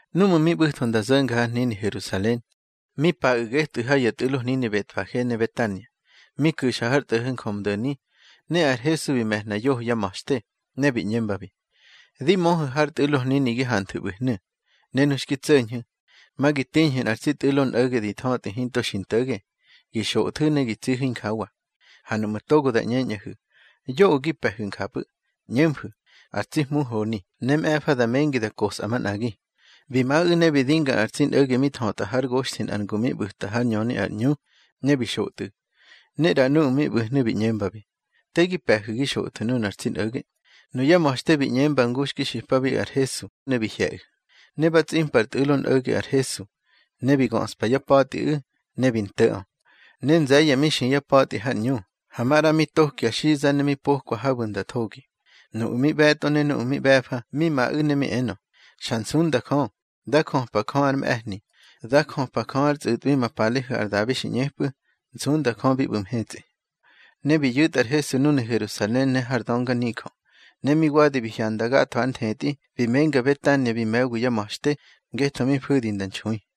Núꞌmu̱ mi ꞌbu̱tho nda zo̱nga har hnini Herusalen, mi paꞌu̱ getꞌu̱ ha ya tꞌu̱lo hnini Betfage ne Betania, mi ku̱xa har tꞌo̱ho̱ Njömdo̱ni. Ne ar Hesu bi me̱hna yoho yá ma̱xte, ne bi ꞌñembabi: —Di möhu̱ har tꞌu̱lo hnini gi hanthu̱ ꞌbu̱hnu̱, ne nu xki tso̱ñhu̱, ma gi tiñhu̱ nꞌar tsi tꞌu̱lo nꞌo̱ge di thötꞌi hinto xi nto̱ge. Gi xothu̱ ne gi tsihu̱ injawa. Ha nuꞌmu̱ togo da ꞌñeñꞌahu̱: Yoꞌö gi pe̱hu̱ njapꞌu̱, ꞌñemfu̱: Ar tsi Hmu honi, ne mꞌe̱fa da mengi da kosꞌa manꞌagi. Bi maꞌu̱ ne bi dinga nꞌar tsi nꞌo̱ge mi thötꞌa hár goxthi nꞌar ngu mi ꞌbu̱ta hár ñöni ar ꞌñu, ne bi xotꞌu̱. Ne ꞌra nuꞌu̱ mi ꞌbu̱hnu̱ bi ꞌñembabi: —Te gi pe̱hu̱ gi xothu̱ nunar tsi nꞌo̱ge. Nuya ma̱xte bi ꞌñemba ngu xki xipabi ar Hesu, ne bi hye̱ꞌu̱. Ne ba tsꞌimpa ar tsi tꞌu̱lo nꞌo̱ge ar Hesu, ne bi göꞌspa yá pa̱tꞌiꞌu̱, ne bi nto̱ꞌö. Ne nze̱ye̱ mi xi yá pa̱tꞌi har ꞌñu, ha maꞌra mi tokwa ya xiza ne mi po̱kwa habu̱ nda thogi. Nuꞌu̱ mi ꞌbe̱tꞌo ne nuꞌu̱ mi ꞌbe̱fa mi maꞌu̱ ne mi enö: —Xa nsunda Jö. Dá jöpa Jö ár mꞌe̱hni. Dá jöpa Jö ár tsꞌu̱tꞌwi ma palehu̱ ar Dabi xi ꞌñepꞌu̱. Nsunda Jö bi ꞌbu̱ mhetsꞌi. Ne bi yu̱tꞌa ar Hesu núnu̱ Herusalen ne har dönganijö. Ne mi wadi bi hyanda gatho ár nthetꞌi, bi menga Betania bi me̱wi yá ma̱xte, ngetho mi fu̱di nda nxui.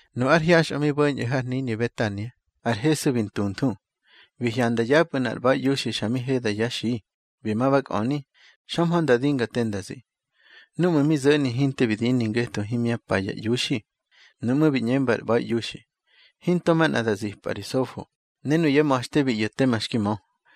Nu ár hyaxꞌö mi bo̱ñꞌu̱ har hnini Betania, ar Hesu bi ntunthu. Bi hyanda yapꞌu̱ nꞌar ꞌba̱iꞌiuxi xa mi heda yá xi, bi ma ba kꞌöni, xömhö nda dinga te nda zi. Núꞌmu̱ mi zo̱ni hinte bi dini ngetho himyá pa ya iuxi. Nuꞌmú̱ bi ꞌñemba ar ꞌba̱iꞌiuxi: —Hinto manꞌa da zimpꞌa ri sofo. Ne nuyá ma̱xte bi ꞌyo̱ tema xki mö.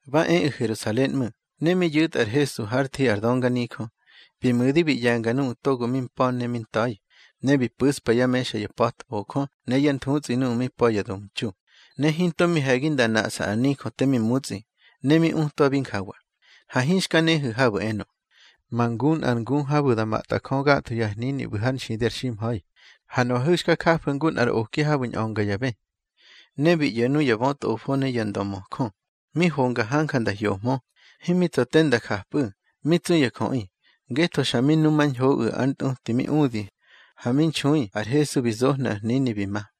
Ba eꞌu̱ Herusalen ꞌmu̱, ne mi yu̱tꞌa ar Hesu hár thi ar dönganijö, bi mu̱di bi ꞌye̱nga nuꞌu̱ togo mi mpa̱ ne mi nta̱i. Ne bi pu̱spa yá mexa ya pa̱tbojö, ne yá nthutsꞌi nuꞌu̱ mi pa̱ ya domtxu. Ne hinto mi he̱gi nda naꞌsa ar nijö te mi mutsꞌi. Ne mi utwabi njawa: —Ha hinxka nehu̱ habu̱ enö: Ma ngu nꞌar ngu habu̱ da matꞌa Jö gatho ya hnini ꞌbu̱ har nxidi ar ximha̱i. Ha nuꞌahu̱ xka jafu̱ ngu nꞌar oki habu̱ ñꞌönga ya bë. Ne bi ꞌyo̱ nuya bötꞌofo ne nuya ndömöjö, mi honga hanja nda hyohmö. Himi tsa̱ te nda japꞌu̱, mi tsu ya jöꞌi, ngetho xa mi numañhoꞌu̱ ár ntꞌuti mi udi. Ha mi nxui ar Hesu bi zohnu̱ ar hnini, bi ma.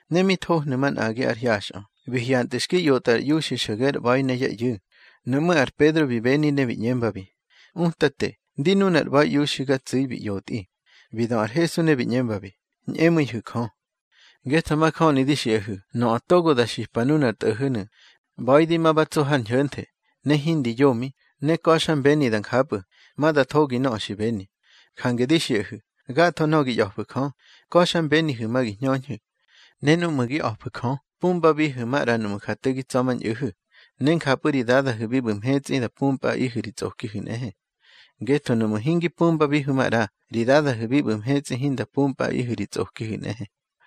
Ne mi thohnu̱ manꞌagi ár hyaxꞌö, bi hyantꞌu̱ xki ꞌyotꞌa ar iuxi xo̱ge ár ꞌba̱i ne yá ꞌyu̱. Nuꞌmú̱ ar Pedro bi beni, ne bi ꞌñembabi: —Utate, ndi nunar ꞌba̱iꞌiuxi ga tsu̱i, bi ꞌyotꞌi. Bi dö ar Hesu ne bi ꞌñembabi: —Ñꞌemu̱ihu̱ Jö. Ngetho majöni di xiꞌahu̱, nöꞌö togo da xipa nunar tꞌo̱ho̱nu̱: ꞌBa̱i di ma ba tso har ñho̱nthe, ne hindi yomi, ne ka̱xmbeni da njapꞌu̱, ma da thogi nöꞌö xi beni. Jange di xiꞌahu̱, gatho nöꞌö gi ꞌya̱fu̱ Jö, ka̱xmbenihu̱ ma gi hñöñhu̱. Ne núꞌmu̱ gi a̱fu̱ Jö, pumbabihu̱ maꞌra nuꞌmu̱ ja te gi tsa̱mañꞌu̱hu̱, ne njapꞌu̱ ri Dadahu̱ bi ꞌbu̱ mhetsꞌi da pumpꞌaꞌihu̱ ri tsꞌokihu̱ nꞌehe. Ngetho nuꞌmu̱ hingi pumbabihu̱ maꞌra, ri Dadahu̱ bi ꞌbu̱ mhetsꞌi hinda pumpꞌaꞌihu̱ ri tsꞌokihu̱ nꞌehe.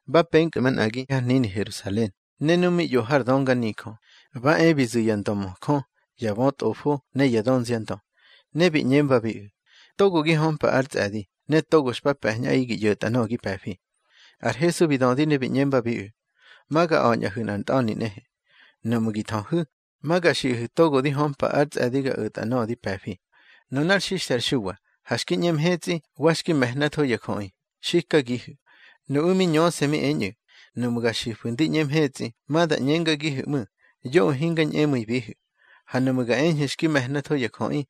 Ba penkꞌu̱ manꞌagi har hnini Herusalen, ne nu mi ꞌyo har dönganijö, ba e bi zu̱ ya ndömöjö, ya bötꞌofo ne ya dönziandö, ne bi ꞌñembabiꞌu̱: —Togo gi hömpa ár tsꞌe̱di, ne togo xpa pe̱ñꞌaꞌi gi ꞌyo̱tꞌa nöꞌö gi pe̱fi. Ar Hesu bi dödi ne bi ꞌñembabiꞌu̱: —Ma ga a̱ñꞌahu̱ nꞌar ntꞌa̱ni nꞌehe. Nuꞌmu̱ gi thöhu̱, ma ga xiꞌahu̱ togo di hömpa ár tsꞌe̱di ga o̱tꞌa nöꞌö di pe̱fi. Nunár xixthe ar Xuwa, ha xki ꞌñe mhetsꞌi, wa xki me̱hnatho ya jöꞌi. Xikagihu̱. Nuꞌu̱ mi ñöse̱ mi eñꞌu̱: —Nuꞌmu̱ ga xifu̱ ndi ꞌñe mhetsꞌi, ma da ꞌñengagihu̱ ꞌmu̱: Yoꞌö hinga ñꞌemu̱ibihu̱. Ha nuꞌmu̱ ga eñhu̱ xki me̱hnatho ya jöꞌi,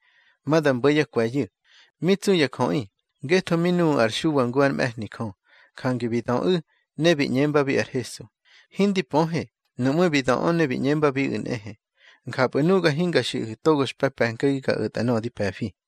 ma da mbo̱ yá kwe̱yu̱. Mi tsu ya jöꞌi, ngetho mi nuꞌu̱ ar Xuwa ngu ár mꞌe̱hni Jö. Jange bi döꞌu̱ ne bi ꞌñembabi ar Hesu: —Hindi pöhe. Nuꞌmú̱ bi döꞌö ne bi ꞌñembabiꞌu̱ nꞌehe: —Njapꞌu̱ nuga hinga xiꞌahu̱ togo xpa pe̱nkagi ga o̱tꞌa nöꞌö di pe̱fi.